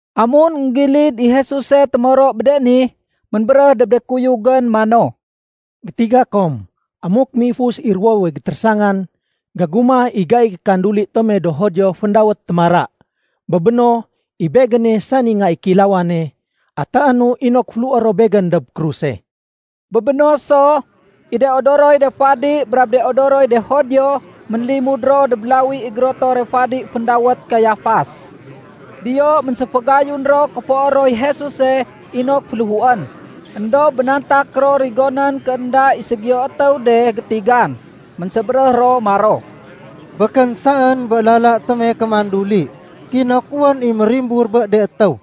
Amun énggilid i Jesuse témoro bé de ni, ménbéréh dob de kuyugén mano, “Gétiga kom amuk méifus i ruwowe gétérésangan, gégumah i gaiy kanduli tome do Judio féndawét ‘Témara.’ Bé béno, i Begéne sani Nga i Kéilawane, atéénu inok féléhué ro Begén dob kruse.” Bé béno so, i de odoroy de fadi brab de odoroy de Judio, ménlimud ro dob lawi i gérotore fadi féndawét Kayafas. Diyo ménséfagayun ro kéfoé roy Jesuse inok féléhuén. Endob bénantak ro rigonén ké énda i ségiyo étéw de gétigan. Ménsébéréh ro maro, “Békén saén bé lala tome kémanduli, kinok wén i mérimbur bé de étéw.”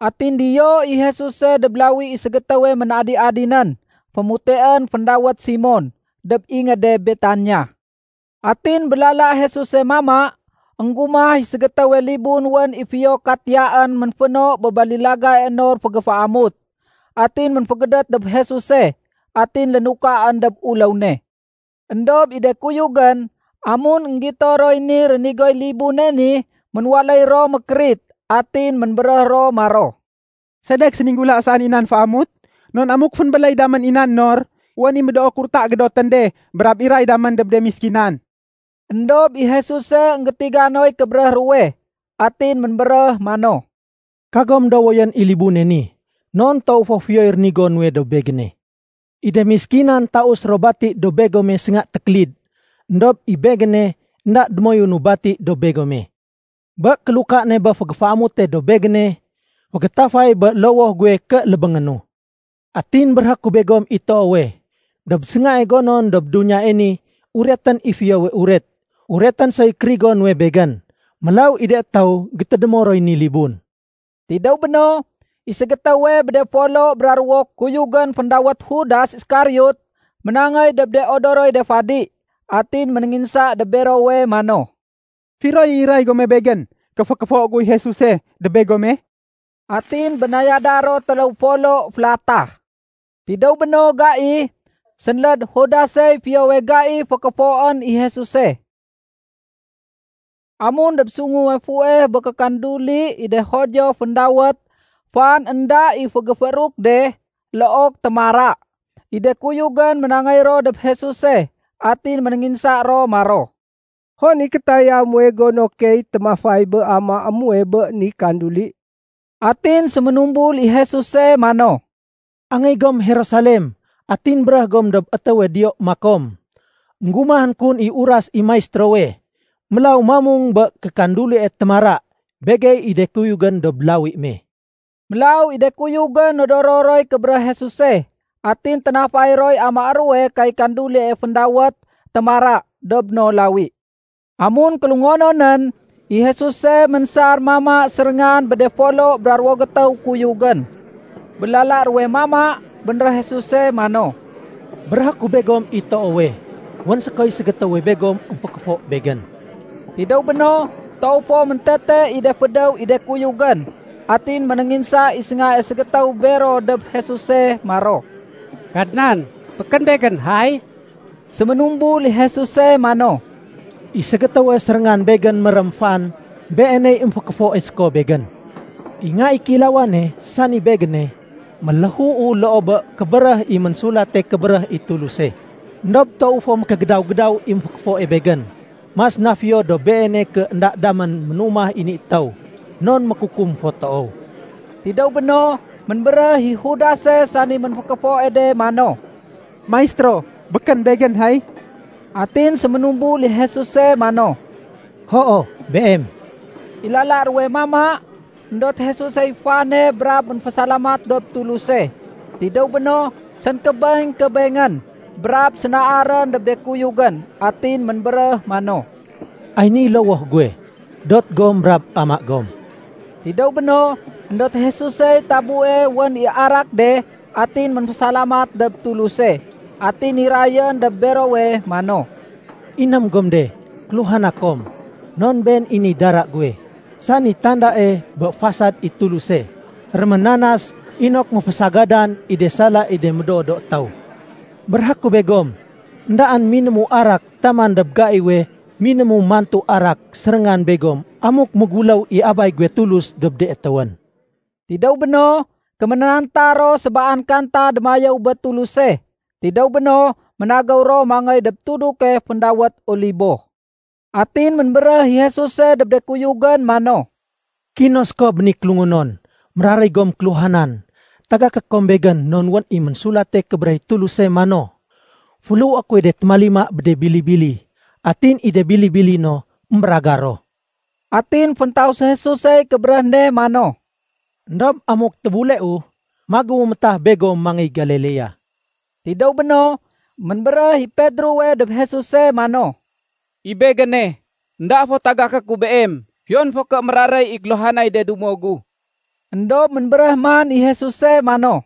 Atin diyo i Jesuse dob lawi i ségétéwe ménadi-adinén fémuteén féndawét Simon, dob ingéde Betania. Atin bé lala Jesuse mama, énggumah i ségétéwe libun wén i fiyo katiyaén ménféno bé balilagae nor fégéféamut. Atin ménfégédét dob Jesuse, atin lénukaén dob uléw ne. Endob i de kuyugén, amun énggito roy ni rénigoy libune ni, ménwaléy ro mékérit. Atin ménbéréh ro maro, “Sedek séninggula saén i nan fégéféamut? Non amuk fénbéléy damén i nan nor, wén i médoo kurta gédotén de brab iray damén dob de méskinan.” Endob i Jesuse énggétiga noy kébéréh ruwe, atin ménbéréh mano, “Kagom dowoyén i libune ni. Non toow fo fiyoy rénigo nuwe dob Begéne. I de méskinan taus ro bati dob begome sénga tékélid, éndob i Begéne énda démoyunu bati dob begome. Bé kéluka ne bé fégéféamute dob Begéne, fégétafay bé lowoh guwe ké lébéngénu. Atin béréhé ku begom i toowe, dob séngae gonon dob duniyae ni uretén i Fiyowe Uret, uretén soy kérigo nuwe Begén. Mélaw i de étéw gétédémo roy ni libun.” Tidéw béno, i ségétéwe bé de folo bra ruwo kuyugén féndawét Judas Iskariot ménangéy dob de odoroy de fadi. Atin ménénginsa dob berowe mano, “Firoy i iray gome begén ké fékéfo guy Jesuse dob begome?” Atin bénayada ro téléw folo félatah. Tidéw bé no gai, sénléd Judasey fiyowe gai fékéfoén i Jesuse. Amun dob sunguwe fuweh bé kékanduli i de Judio féndawét “Fan énda i Fégéfééruk de” look “Témara”, i de kuyugén ménangéy ro dob Jesuse atin ménénginsa ro maro, “Hon i kétaya muwe gono key témafay bé amaé muwe bé ni kanduli?” Atin séménumbul i Jesuse mano, “Angéy gom Jerusalem atin béréh gom dob étéwe diyo makom, ‘Enggumahén kun i uras i Maistérowe. Mélaw mamung bé kékandulie “Témara” begey i de kuyugén dob lawi me.’” Mélaw i de kuyugén nodoro roy kébéréh Jesuse, atin ténafay roy amaé ruwe kay kandulie féndawét “Témara” dob no lawi. Amun kélungononén, i Jesuse ménsar mama séréngan bé de folo bra ruwo gétéw kuyugén. Bé lala ruwe mama, bénréh Jesuse mano, “Béréhé ku begom i toowe, wén sékoy ségétéwe begom émfékéfo Begén.” Tidéw béno, toow fo méntete i de fédéw i de kuyugén, atin ménénginsa i séngae ségétéw bero dob Jesuse maro, “Kadnan, békén begén, hay?” Séménumbul i Jesuse mano, “I ségétéwe séréngan Begén mérém fan, beeney émfékéfoe séko Begén. I Nga i Kéilawane, sani Begéne, méléhuu loo bé kébéréh i Ménsulate Kébéréh i Tuluse. Endob toow fo mékégédaw-gédaw i émfékéfoe Begén. Mas na fiyo dob beene ké énda damén ménumah i ni étéw, non mékukum fo toow.” Tidéw béno, ménbéréh i Judase sani ménfékéfoe de mano, “Maistéro, békén begén, hay?” Atin séménumbul i Jesuse mano, “Hoo, beem.” I lala ruwe mama, éndot Jesusey fane brab ménfésalamat dob Tuluse. Tidéw béno, sénkébeng-kébengén, brab sénaarén dob de kuyugén. Atin ménbéréh mano, “Ay niy lowoh guwe. Dot gom brab ama gom.” Tidéw béno, éndot Jesusey tabue wén i arak de atin ménfésalamat dob Tuluse. Atin nirayén dob berowe mano, “Iném gom de, kéluhana kom. Non been i niy dara guwe, sani tandae bé fasad i Tuluse, réménanas inok méfésagadan i de sala i de médoo do étéw. Béréhé ku begom, éndaén minému arak taman dob gaiwe minému mantu arak séréngan begom amuk méguléw i Abay guwe Tulus dob de étéwén.” Tidéw béno, kéménanta ro sébaan kanta démayéw bé Tuluse. Tidéw béno, ménagéw ro mangéy dob tuduke féndawét Olibo. Atin ménbéréh i Jesuse dob de kuyugén mano, “Kino séko bé ni kélungonon méraréy gom kéluhanan tagaké kom Begén non wén i Ménsulate Kébéréh i Tuluse mano, ‘Féléhué kuy témalimae bé de bili-bili, atin i de bili-bili no émbéragar ro.’” Atin féntaus Jesusey kébéréh me mano, “Endob amuk tébuleu, magéwu métah begom mangéy Galilea.” Tidéw béno, ménbéréh i Pedrowe dob Jesuse mano, “I begéne, énda fo tagaké ku Beem, fiyon fo ké méraréy i kéluhanay de dumo gu.” Endob ménbéréh man i Jesuse mano,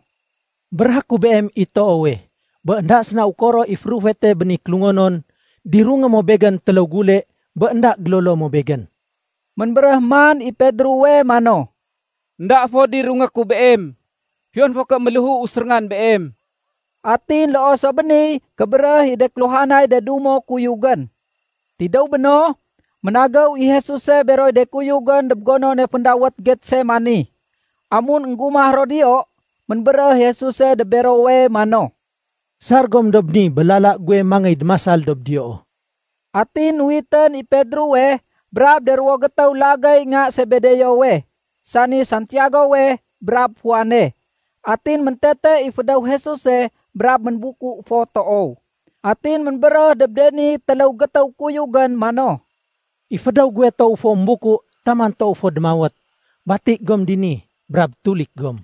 “Béréhé ku beem i toowe, bé énda séna ukoro i férufete bé ni kélungonon, dirungé mo Begén téléw gule bé énda gélolo mo Begén.” Ménbéréh man i Pedrowe mano, “Enda fo dirungé ku Beem, fiyon fo ké méléhuu séréngan Beem.” Atin loo so bé niy kébéréh i de kéluhanay de dumo kuyugén. Tidéw béno, ménagéw i Jesuse beroy de kuyugén dob gonone féndawét Getsemani. Amun énggumah ro diyo, ménbéréh i Jesuse dob berowe mano, “Sar gom dob ni bé lala guwe mangéy démasal dob diyoo.” Atin nuwitén i Pedrowe brab de ruwo gétéw lagéy nga Sebedeowe, sani Santiagowe brab Juane. Atin méntete i fédéw Jesuse brab ménbuku fo toow. Atin ménbéréh dob de ni téléw gétéw kuyugén mano, “I fédéw guwe toow fo ménbuku taman toow fo démawét. Bati gom dini, brab tulik gom.”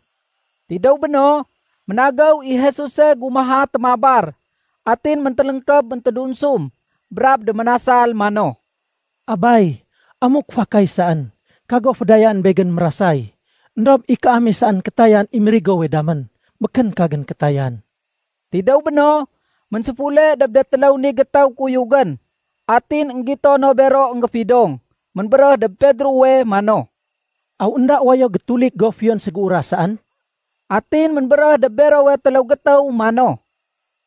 Tidéw béno, ménagéw i Jesuse gumaha témabar. Atin méntéléngkéb méntédunsum brab déménasal mano, “Abay, amuk fakay saén, kago fédayaén Begén mérasay. Endob i kaame saén kétayan i mérigowe damén, békén kagén kétayan.” Tidéw béno, ménséfule dob de téléw ni gétéw kuyugén. Atin énggito no bero énggéfidong. Ménbéréh dob Pedrowe mano, “Aw énda wayo gétulik go fiyon ségéuras saén?” Atin ménbéréh dob berowe téléw gétéw mano,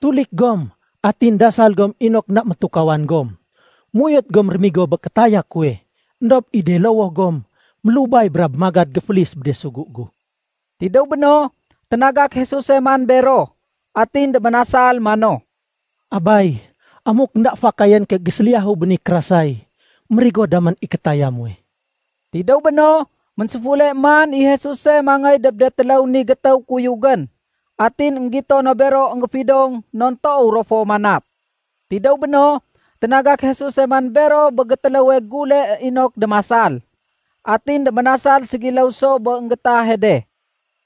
“Tulik gom, atin dasal gom inok énda métukawan gom. Méuyot gom rémigo bé kétaya kuwe, éndob i de lowoh gom mélubay brab magad géfélis bé de sugu gu.” Tidéw béno, ténagak Jesuse man bero, atin déménasal mano, “Abay, amuk énda fakayén ké géséliyahu bé ni kérasay, mérigo damén i kétaya muwe.” Tidéw béno, ménséfule man i Jesuse mangéy dob de téléw ni gétéw kuyugén. Atin énggito no bero énggéfidong non toow ro fo manat. Tidéw béno, ténagak Jesuse man bero bé gétéléwe gule inok démasal. Atin déménasal ségiléw so bé énggéétahe de.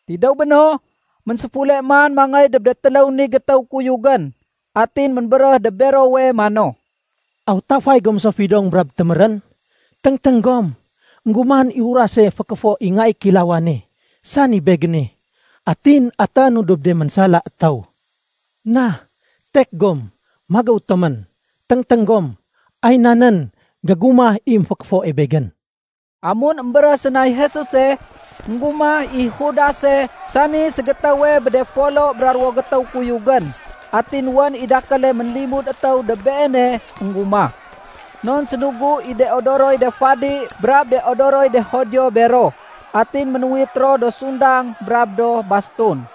Tidéw béno, ménséfule man mangéy dob de téléw ni gétéw kuyugén atin ménbéréh dob berowe mano, “Aw tafay gom so fidong brab témérén? Téngténg gom! Enggumahén i urase fékéfo i Nga i Kéilawane, sani Begéne, atin atéénu dob de ménsala étéw. Na, tek gom, magéw tomén. Téngténg gom, ay nan nén gégumah i émfékéfoe Begén!” Amun émbéréh sénay Jesuse, énggumah i Judase sani ségétéwe bé de folo bra ruwo gétéw kuyugén. Atin wén i dakéle ménlimud étéw dob beene énggumah. Non sénugu i de odoroy de fadi brab de odoroy de Judio bero. Atin ménuwit ro do sundang brab do bastun.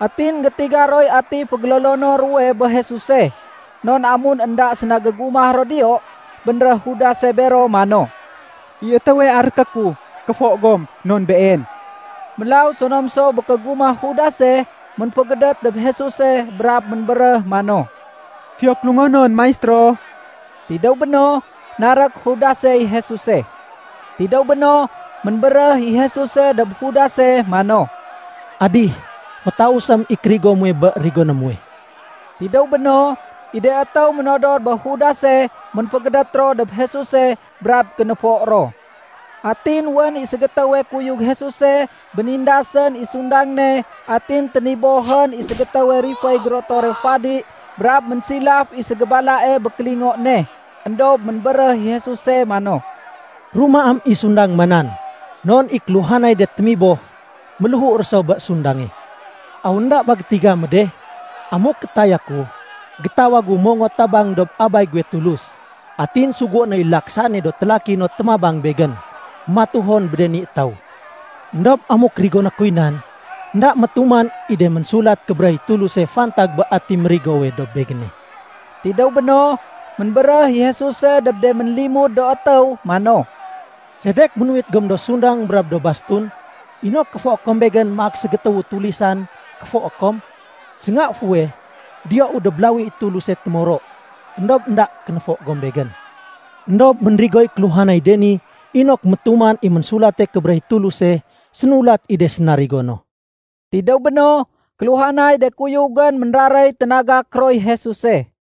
Atin énggétiga roy ati fégélolono ruwe bé Jesuse, non amun énda séna gégumah ro diyo, bénréh Judase bero mano, “I étéwe aréké ku, kéfo gom non Been.” Mélaw sonom so bé kégumah Judase, ménfégédét dob Jesuse brab ménbéréh mano, “Fiyo kélungonon, Maistéro.” Tidéw béno, narék Judasey Jesuse. Tidéw béno, ménbéréh i Jesuse dob Judase mano, “Adih, fétausém i kérigo muwe bé rigoné muwe.” Tidéw béno, i de étéw ménodor bé Judase, ménfégédét ro dob Jesuse brab kénéfo ro. Atin wén i ségétéwe kuyug Jesuse bénindasén i sundang ne atin ténibohén i ségétéwe riféy gérotore fadi brab ménsilaf i ségébalae bé kélingo ne. Endob ménbéréh i Jesuse mano, “Rumaém i sundang ma nan. Non i kéluhanay de témiboh, méléhu ro so bé sundange. Aw énda ba gétiga mo de? Amuk kétaya ku, gétawagu mongot tabang dob Abay guwe Tulus, atin sugué noy laksaéne do télaki no témabang Begén matuhon bé de ni étéw. Endob amuk rigoné kuy nan, énda métuman i de Ménsulat Kébéréh i Tuluse fantag bé ati mérigowe dob Begéne.” Tidéw béno, ménbéréh i Jesuse dob de ménlimud do étéw mano, “Sedek ménuwit gom do sundang brab do bastun, inok kéfoé kom Begén maak ségétéwu tulisan kéfoé kom? Sénga fuweh diyou dob lawi i Tuluse témoro, éndob énda kénéfo gom Begén. Endob ménrigoy kéluhanay de ni inok métuman i Ménsulate Kébéréh i Tuluse sénulat i de sénarigo no.” Tidéw béno, kéluhanay de kuyugén ménraréy ténagak roy Jesuse.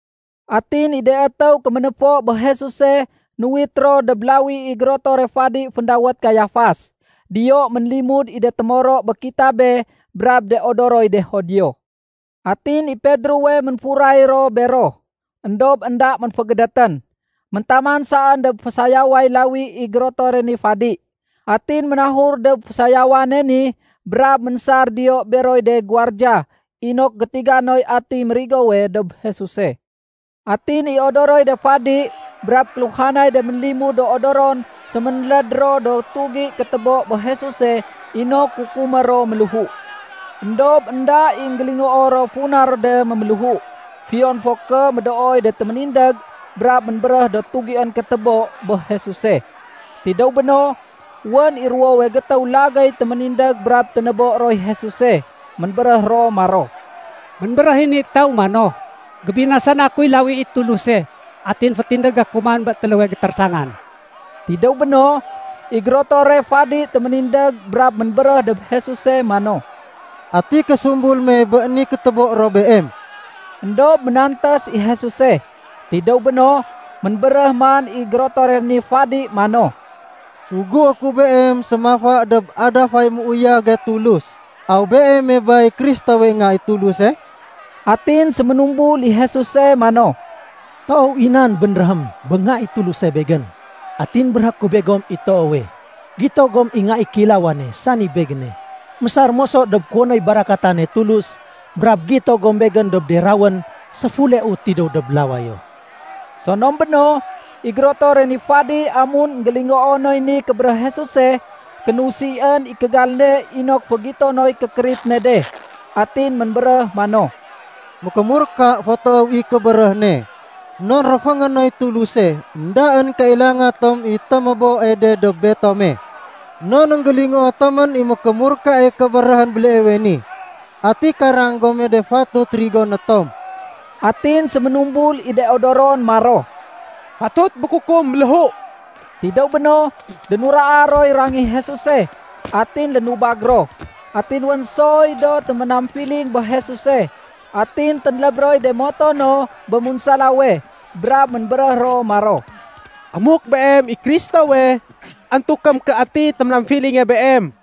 Atin i de étéw kéménéfo bé Jesuse nuwit ro dob lawi i gérotore fadi féndawét Kayafas. Diyo ménlimud i de témoro bé kitabé brab de odoroy de Judio. Atin i Pedrowe ménfuray ro bero éndob énda ménfégédétén, méntaman saén dob fésayaway lawi i gérotore ni fadi. Atin ménahur dob fésayawane ni brab ménsar diyo beroy de guwardiya inok gétiga noy ati mérigowe dob Jesuse. Atin i odoroy de fadi brab kéluhanay de ménlimud do odoron séménléd ro do tugi kétébo bé Jesuse inok kukumé ro méléhu. Endob énda i énggélingoo ro funa ro de méméléhu, fiyon fo ké médooy de téménindég brab ménbéréh do tugién kétébo bé Jesuse. Tidéw béno, wén i ruwowe gétéw lagéy téménindég brab ténébo roy Jesuse. Ménbéréh ro maro, “Ménbéréh i ni étéw mano, ‘Gébinasana kuy lawi i Tuluse atin fétindégé ku man bé téléwe gétérésangan.’” Tidéw béno, i gérotore fadi téménindég brab ménbéréh dob Jesuse mano, “Ati késumbul me bé ni kétébo ro Beem?” Endob ménantés i Jesuse. Tidéw béno, ménbéréh man i gérotore ni fadi mano, “Sugué ku Beem sémafa dob adafay méuyage Tulus, aw Beeme bay Kristowe Nga i Tuluse?” Atin séménumbul i Jesuse mano, “Toow i nan bénréhém bé Nga i Tuluse Begén. Atin béréhé ku begom i toowe, gito gom i Nga i Kéilawane, sani Begéne, mésar moso dob kuwonoy barakatane Tulus brab gito gom Begén dob de rawén séfuleu tidéw dob lawayo.” Sonom béno, i gérotore ni fadi amun énggélingoo noy ni kébéréh Jesuse, kénusién i kégal ne inok fégito noy kékérit ne de. Atin ménbéréh mano, “Mékémurka fo toow i kébéréh ne non réféngé noy Tuluse! Endaén kailanga tom i téméboe de dob betome. Non énggélingoo tomén i mékémurkae kébéréhén béleewe ni. Ati karang gome de fatut rigoné tom?” Atin séménumbul i de odoron maro, “Fatut mékukum méléhu.” Tidéw béno, dénuraa roy rangih Jesuse atin lénubag ro. Atin wén soy do téménamfiling bé Jesuse. Atin ténléb roy de moto no bé munsalawe brab ménbéréh ro maro, “Amuk Beem i Kristowe, antukém ké ati téménamfilinge Beem.”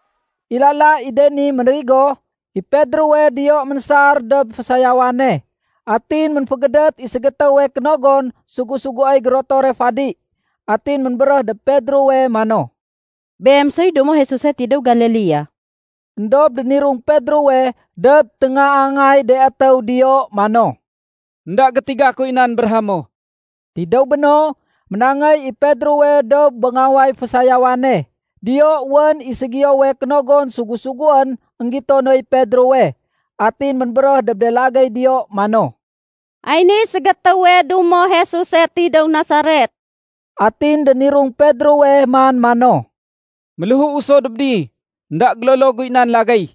I lala i de ni mérigo, i Pedrowe diyo ménsar dob fésayawane. Atin ménfégédét i ségétéwe kénogon sugu-suguéy gérotore fadi. Atin ménbéréh dob Pedrowe mano, “Beem soy dumo Jesuse tidéw Galilea.” Endob dénirung Pedrowe dob téngaangay de étéw diyo mano, “Enda gétiga kuy nan béréhé mo.” Tidéw béno, ménangéy i Pedrowe dob béngaway fésayawane. Diyo wén i ségiyowe kénogon sugu-suguén énggito noy Pedrowe. Atin ménbéréh dob de lagéy diyo mano, “Ay niy ségétéwe dumo Jesuse tidéw Nasaret.” Atin dénirung Pedrowe man mano, “Méléhuu so dob ni, énda gélolo guy nan lagéy.”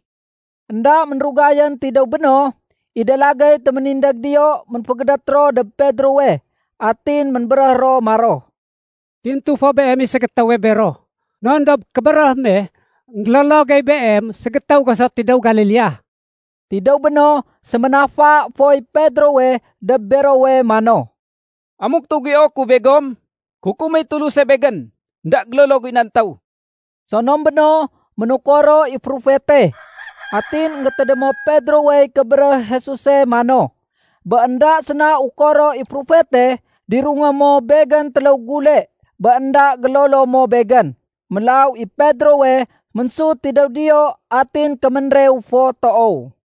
Enda ménrugayén tidéw béno, i de lagéy téménindég diyo ménfégédét ro dob Pedrowe. Atin ménbéréh ro maro, “Tintu fo beem i ségétéwe bero. Non dob kébéréh me énggélolo gey beem ségétéw go so tidéw Galilea.” Tidéw béno, séménafa foy Pedrowe dob berowe mano, “Amuk tugio ku begom, kukuméy Tuluse begén. Enda gélolo guy nan étéw!” Sonom béno, ménukoro i férufete. Atin énggétédémo Pedrowey kébéréh Jesuse mano, “Bé énda séna ukoro i férufete, dirungé mo Begén téléw gule bé énda gélolo mo Begén.” Mélaw i Pedrowe, ménsut tidéw diyo atin kéménrew fo toow.